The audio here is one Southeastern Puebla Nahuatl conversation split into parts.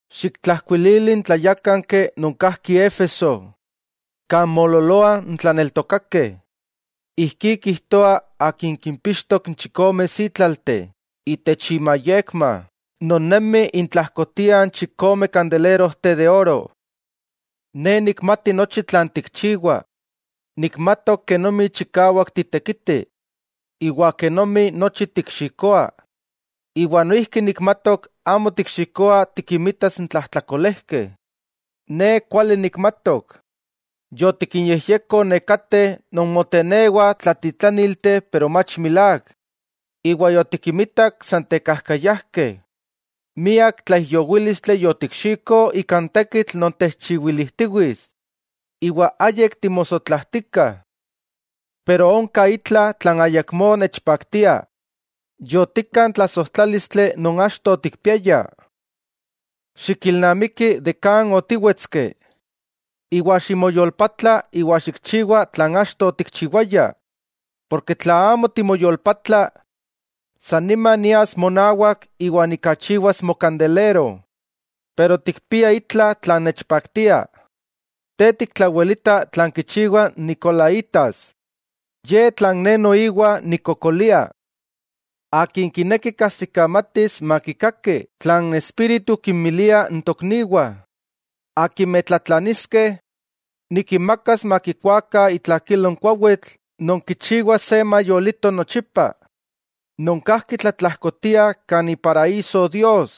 'Xiktlajkuilili n tlayákanki non kajki Éfeso kan moololoah n tlaneltokakeh: “Ijkí kijtoa Akin kimpixtok n chikome sítlalteh itech imayekma, non nemi intlajkotiah n chikome kandelerojteh de oro: Ne nikmati nochi tlan tikchiwa. Nikmatok kenomi chikawak titekiti iwa kenomi nochi tikxikoa, iwa noijki nikmatok amo tikxikoa tikinmitas n tlajtlakolejkeh. Ne kuali nikmatok yotikinyejyeko nekateh non motenewah tlatitlánilti pero mach milák, iwa yotikinmitak san tekajkayajkeh. Miak tlaijyowílistli yotikxiko ika n tekitl non techchiwilijtiwits, iwa ayik timosotlajtika. Pero onka itla tlan ayakmó nechpaktia: Yotikka n tlasojtlalístli non achto otikpiaya. Xikilnamiki de kan otíwetski, iwa ximoyolpatla iwa xikchiwa tlan achto otikchiwaya. Porke tla amo timoyolpatla, san nima nias monawak iwa nikachiwas mokandelero. Pero tikpia itla tlan nechpaktia: te tiktlawelita tlan kichiwah n nicolaítas, ye tlan ne noiwa nikkokolia. Akin kineki kajsikamatis makikaki tlan n Espíritu kinmilia n tokniwah: Akimeh tlatlaniskeh, nikinmakas makikuakah itlakilo n kuawitl non kichiwa se mayolito nochipa, non kajki tlatlajkotia kan ixochitlalpa Dios.”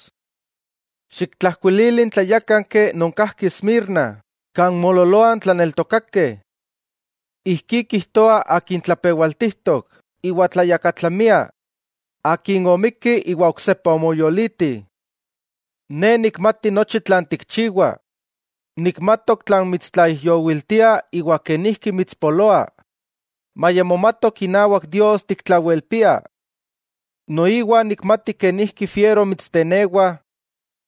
'Xiktlajkuilili n tlayákanki non kajki Esmirna kan moololoah n tlaneltokakeh: “Ijkí kijtoa Akin tlapewaltijtok iwa tlayakatlamia, Akin omikki iwa oksepa omoyoliti: Ne nikmati nochi tlan tikchiwa. Nikmatok tlan mitstlaijyowiltia iwa kenijki mitspoloa, maya momatok inawak Dios tiktlawelpia. Noiwa nikmati kenijki fiero mitstenewah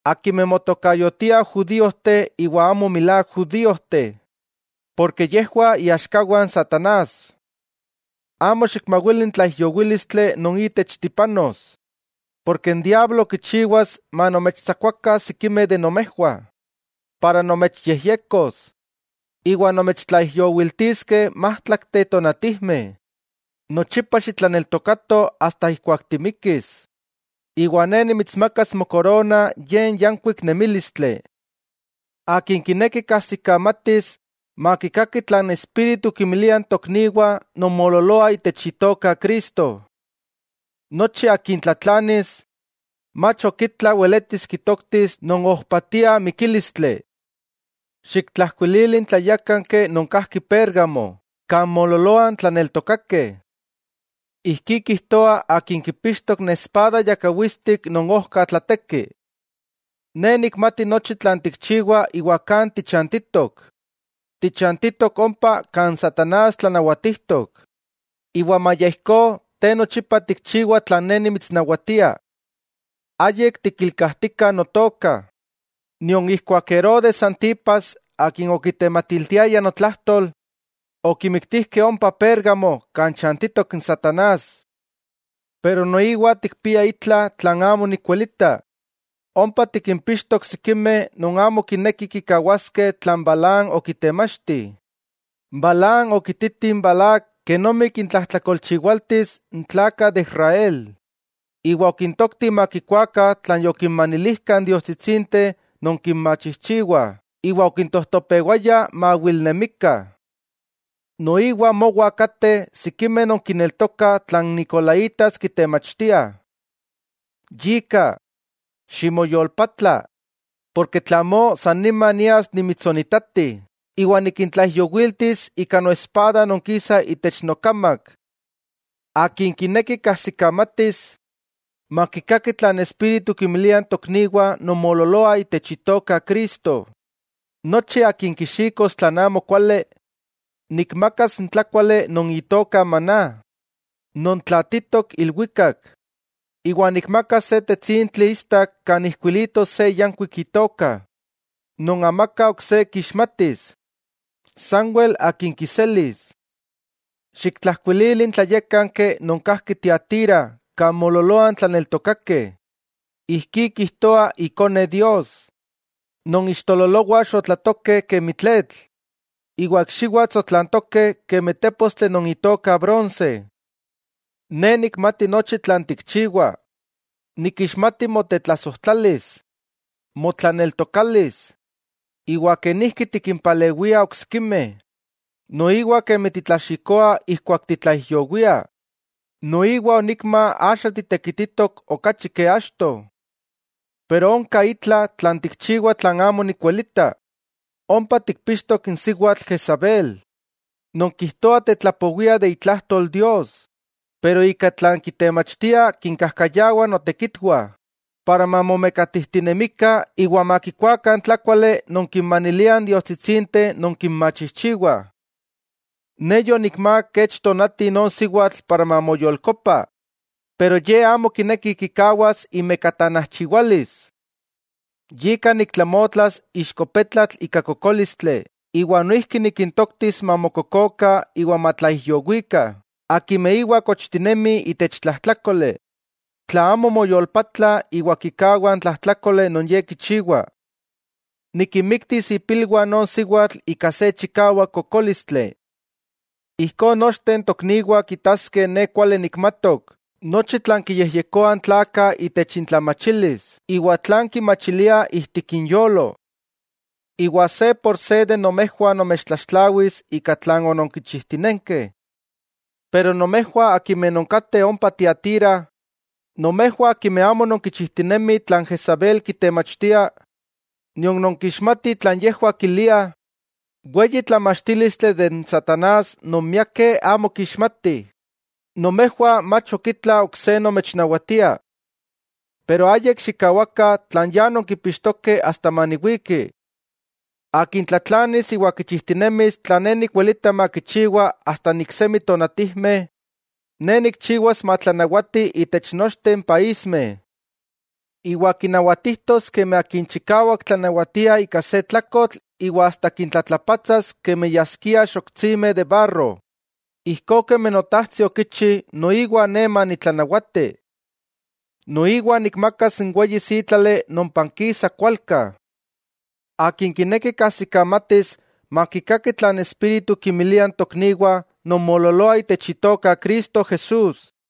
akimeh motokayotiah judíojteh iwa amo milák judíojteh, porke yejwah iaxkawah n satanás. Amo xikmawili n tlaijyowílistli non itech tipanos, porke n diablo kichiwas manomechtsakuakah sikimeh de nomejwah, ijkó nomechyejyekos, iwa nomechtlaijyowiltiskeh májtlakteh tonatijmeh. Nochipa xitlaneltokato asta ijkuak timikis, iwa ne nimitsmakas mokorona ye n yankuik nemílistli. Akin kineki kajsikamatis makikaki tlan n Espíritu kinmilia n tokniwah non moololoah itech Itoka Cristo. Nochi akin tlatlanis, mach ok itla weletis kitoktis non ojpatia mikílistli.” 'Xiktlajkuilili n tlayákanki non kajki Pérgamo kan moololoah n tlaneltokakeh: “Ijkí kijtoa Akin kipixtok n espada yakawitstik non ojka tlateki: Ne nikmati nochi tlan tikchiwa iwa kan tichantitok. Tichantitok ompa kan satanás tlanawatijtok, iwa maya ijkó te nochipa tikchiwa tlan Ne nimitsnawatia. Ayik tikilkajtika Notoka, nion ijkuak Herodes Antipas akin okitematiltiaya notlajtol okimiktijkeh ompa Pérgamo kan chantitok n satanás. Pero noiwa tikpia itla tlan amo nikwelita: ompa tikimpixtok sikimeh non amo kinekih kikawaskeh tlan Balaam okitemachti. Balaam okititi n Balac kenomi kintlajtlakolchiwaltis n tlakah de Israel, iwa okintoktih makikuakah tlan yokinmanilijkah n diostsitsinteh non kinmachijchiwah iwa okintojtopewaya maawilnemikah. Noiwa mowa kateh sikimeh non kineltokah tlan n nicolaítas kitemachtiah. Yika, ximoyolpatla, porke tla amó, san nima nias nimitsonitati iwa nikintlaijyowiltis ika noespada non kisa itech nokamak. Akin kineki kajsikamatis, makikaki tlan n Espíritu kinmilia n tokniwah non moololoah itech Itoka Cristo: Nochi akin kixikos tlan amokuali, nikmakas n tlákuali non itoka maná, non tlaatitok ilwikak; iwa nikmakas se tetsintli istak kan ijkuilitos se yankuik itoka, non amaka ok se kixmatis, sanwel akin kiselis.” 'Xiktlajkuilili n tlayákanki non kajki Tiatira kan moololoah n tlaneltokakeh: “Ijkí kijtoa Ikone Dios, non ixtololowah xotlatokeh kemi tletl, iwa ikxiwah tsotlantokeh kemi tépostli non itoka bronse. Ne nikmati nochi tlan tikchiwa. Nikixmati motetlasojtlalis, motlaneltokalis, iwa kenijki tikimpalewia oksikimeh, noiwa kemi titlaxikoa ijkuak titlaijyowia, noiwa onikma axa titekititok okachi ke achto. Pero onka itla tlan tikchiwa tlan amo nikwelita, ompa tikpixtok n siwatl Jezabel, non kijtoa tetlapowia de itlajtol Dios pero ika tlan kitemachtia kinkajkayawa notekitwah para mamomekatijtinemikah iwa makikuakah n tlákuali non kinmaniliah n diostsitsinteh non kinmachijchiwah. Ne yonikmák kech tonati non siwatl para mamoyolkopa pero ye amo kineki kikawas imekatanajchiwalis. Yika niktlamotlas ixko petlatl ika kokólistli iwa noijki nikintoktis mamokokokah iwa matlaijyowikah akimeh íwa kochtinemih itech tlajtlákoli, tla amo moyolpatlah iwa kikawah n tlajtlákoli non ye kichiwa, nikinmiktis ipilwah non siwatl ika se chikawak kokólistli. Ijkó nochteh n tokniwah kitaskeh Ne kuali nikmatok nochi tlan kiyejyekoah n tlakah itech intlamachilis iwa tlan kimachiliah ijtik inyolo. Iwa se por se de nomejwah nomechtlaxtlawis ika tlan ononkichijtinenkeh. Pero nomejwah akimeh nonkateh ompa Tiatira, nomejwah akimeh amo nonkichijtinemih tlan Jezabel kitemachtia nion nonkixmatih tlan yejwah kiliah “weyi tlamachtílistli de n satanás non miakeh amo kixmatih”, nomejwah mach ok itla ok se nomechnawatia. Pero ayik xikkawakah tlan ya nonkipixtokeh asta maniwiki. Akin tlatlanis iwa kichijtinemis tlan Ne nikwelita makichiwa asta n iksemi tonatijmeh, Ne nikchiwas matlanawati itech nochteh n paísmeh, iwa kinawatijtos kemi akin chikawak tlanawatia ika se tlakotl iwa asta kintlatlapatsas kemi yaskiah xoktsimeh de barro, ijkó kemi Notajtsi okichi noiwa Ne manitlanawati. Noiwa nikmakas n weyi sítlali non pankisa kualka. Akin kineki kajsikamatis makikaki tlan n Espíritu kinmilia n tokniwah non moololoah itech Itoka Cristo Jesús.”